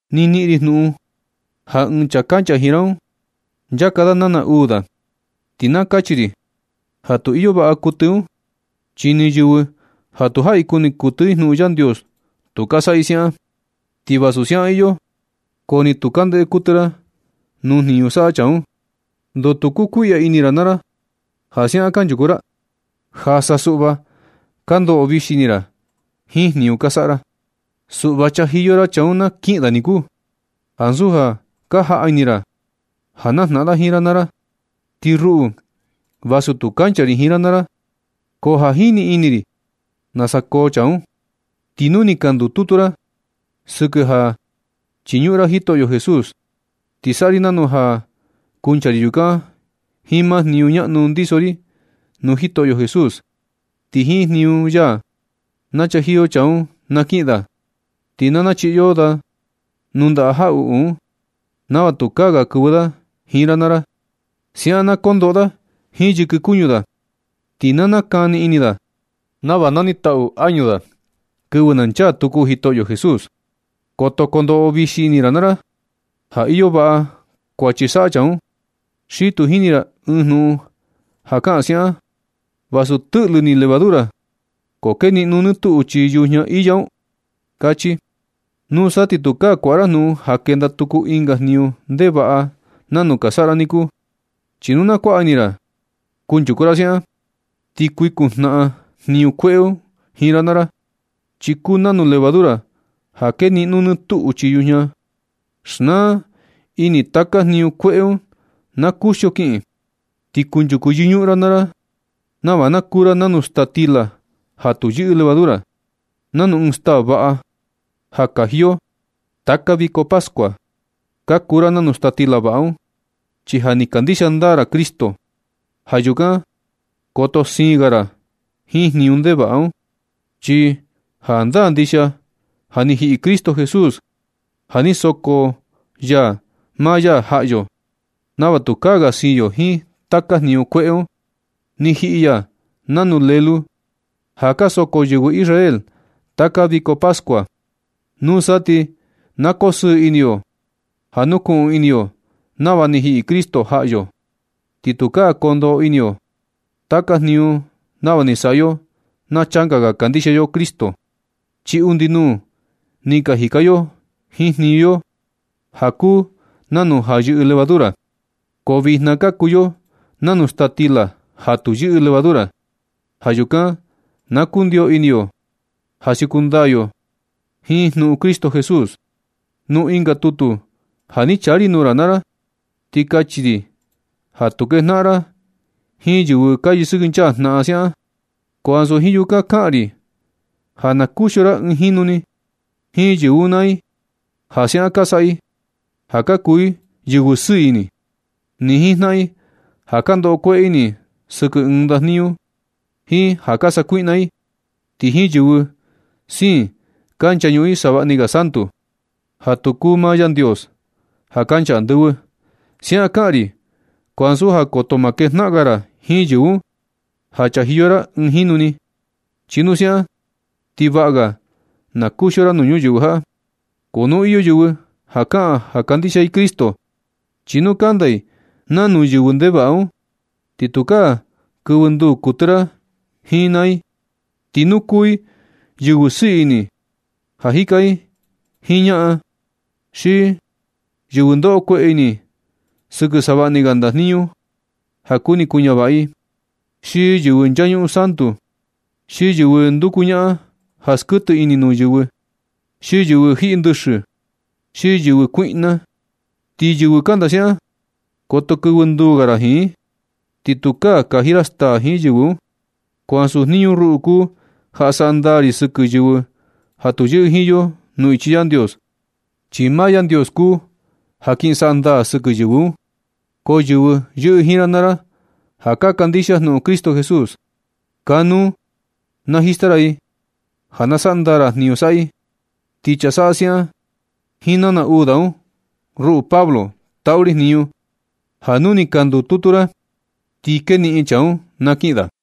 Ni niꞌin ri jnuꞌun ja ɨɨn chaa kancha jiin ra un nchaka da nana uu da. Ti na kachi ri ja tu iyo vaꞌa kuɨtɨ un, chi ni yɨvɨ ja tu jaꞌi kuni kuɨtɨ i jnuꞌun Yandios tu ka saꞌa i siaꞌan. Ti vasu siaꞌan iyo, ko ni tu ka ndeꞌe kuɨtɨ ra nuu jniñu saꞌa chaa un. ¿Ndoo tu kukuiꞌya ini ra naa ra ja siaꞌan kanchuku ra? Ja sa suꞌva ka ndoꞌo vixi ini ra jiin jniñu ka saꞌa ra. Suꞌva chajiyo ra chaa un na kiꞌin da niku, ansu ja ka jaꞌa ini ra ja najnaꞌan da jiin ra naa ra. Ti ruꞌu, vasu tu kancha ri jiin ra naa ra, ko ja jini ini ri nasa koo chaa un. Ti nu ni ka ndututu ra sɨkɨ ja chiñuꞌun ra Jitoꞌyo Jesús, ti saꞌa ri nanu ja kuncha ri yukan jiin maa jniñu ñaꞌnu ndiso ri nuu Jitoꞌyo Jesús, ti jiin jniñu ya na chajiyo chaa un na kiꞌin da. Ti na nachiꞌi yo da nuu ndaꞌa jaꞌuꞌu un, nava tukaa ga kɨvɨ da jiin ra naa ra. Siaꞌan na kondoꞌo da jiin yɨkɨ kuñu da, ti na nakani ini da nava na niꞌin taꞌu añu da kɨvɨ na nchaa tuku Jitoꞌyo Jesús. Koto kondoꞌo vixi ini ra naa ra ja iyo vaꞌa kuachi saꞌa chaa un. Xi tu jini ra ɨɨn jnuꞌun ja kaꞌan siaꞌan: “¿Vasu tɨꞌlɨ ni levadura ko keniꞌno nɨ tuꞌu chii yujña iya nu”? kachi. Nusa ti tukaa kuaꞌa ra jnuꞌun ja kenda tuku ɨnga jniñu ndevaꞌa nanu ka saꞌa ra niku. Chi nu na kuaꞌa ini ra kunchuku ra siaꞌan, ti kuikun jnaꞌan jniñu kueꞌe un jiin ra naa ra, chi kuu nanu levadura ja keniꞌno nɨ tuꞌu chii yujña. Xnaa ini taka jniñu kueꞌe un na kuxio kiꞌin, ti kunchuku yɨñuꞌun naa ra nava na kuu ra nanu staa stila ja tu yɨꞌɨ levadura, nanu ɨɨn staa vaꞌa ja kaji yo taka viko pascua. Ka kuu ra nanu staa stila vaꞌa un, chi ja ni ka kandixia ndaa ra Cristo. Ja yukan, koto siin ga ra jiin jniñu ndevaꞌa un. Chi jandaa ndixia ja ni jiꞌi Cristo Jesús ja ni soko ya maa ya jaꞌa yo, nava tukaa ga siin yo jiin taka jniñu kueꞌe un. Ni jiꞌi ya nanu lelu ja ka soko yɨvɨ Israel taka viko pascua. Nusa ti na koo sɨɨ ini yo ja nukuꞌun ini yo nava ni jiꞌi Cristo jaꞌa yo, ti tukaa kondoꞌo ini yo taka jniñu nava ni saꞌa yo na changa ga kandixia yo Cristo, chi undi nuu ni ka jika yo jiin jniñu yo ja kuu nanu ja yɨꞌɨ levadura. Ko vijna ka kuu yo nanu staa stila ja tu yɨꞌɨ levadura. Ja yukan na kundio ini yo ja siuku ndaa yo jiin jnuꞌun Cristo Jesús. Nuu ɨnga tutu ja ni chaa ri nuu ra naa ra, ni kachi ri ja tu kejnaꞌan ra jiin yɨvɨ ka yɨsɨkɨnchaa jnaꞌan siaꞌan. Ko ansu jiin yukan kaꞌan ri ja na kuxio ra ɨɨn jinu ni jiin yɨvɨ un naa i, ja siaꞌan ka saꞌa i ja ka kuu i yɨvɨ sɨɨ ini, ni jiin jnaꞌan i ja ka ndoꞌo kueꞌe ini i sɨkɨ ɨɨn ndajniñu, ni jiin ja ka sakuiꞌna i, ti ni jiin yɨvɨ siin ka nchañuꞌun savaꞌni ga santu, ja tu kuu maa Yandios ja kancha andɨvɨ. Siaꞌan kaꞌan ri, ko ansu ja koto ma kejnaꞌan ga ra jiin yɨvɨ un ja chajiyo ra ɨɨn jinu ni, chi nu siaꞌan ti vaꞌa ga na kuxio ra nuu ñuyɨvɨ jaꞌa. Ko nu iyo yɨvɨ ja kaꞌan ja kandixia i Cristo, chi nu kanda i nanu yɨvɨ ndevaꞌa un, ti tukaa kɨvɨ nduu kuɨtɨ ra jiin i naa i. Ti nu kuu i yɨvɨ sɨɨ ini ja jika jiin ñaꞌan, xi yɨvɨ ndoꞌo kueꞌe ini sɨkɨ savaꞌni ga ndajniñu ja kuni kuñavaꞌa i, xi yɨvɨ nchañuꞌun santu, xi yɨvɨ nduku ñaꞌan ja skuɨtɨ ini nuu yɨvɨ, xi yɨvɨ jiꞌi ndɨxɨ, xi yɨvɨ kuiꞌna i, ti yɨvɨ kanda siaꞌan, koto kɨvɨ nduu ga ra jiin i, ni tukaa kaji ra staa jiin yɨvɨ un. Ko ansu jniñu ruꞌu kuu ja saꞌa ndaa ri sɨkɨ yɨvɨ ja tu yɨꞌɨ jiin yo nuu ichi Yandios, chi maa Yandios kuu ya kin saꞌa ndaa sɨkɨ yɨvɨ un. Ko yɨvɨ yɨꞌɨ jiin ra naa ra ja ka kandixia jnuꞌun Cristo Jesús, kanuu najista ra i ja na saꞌa ndaa ra jniñu saꞌa i. Ti chaa saꞌa siaꞌan jiin nana uu da un, ruꞌu Pablo, taꞌu ri jniñu ja nu ni ka ndututu ra, ti keniꞌin chaa un na kiꞌin da.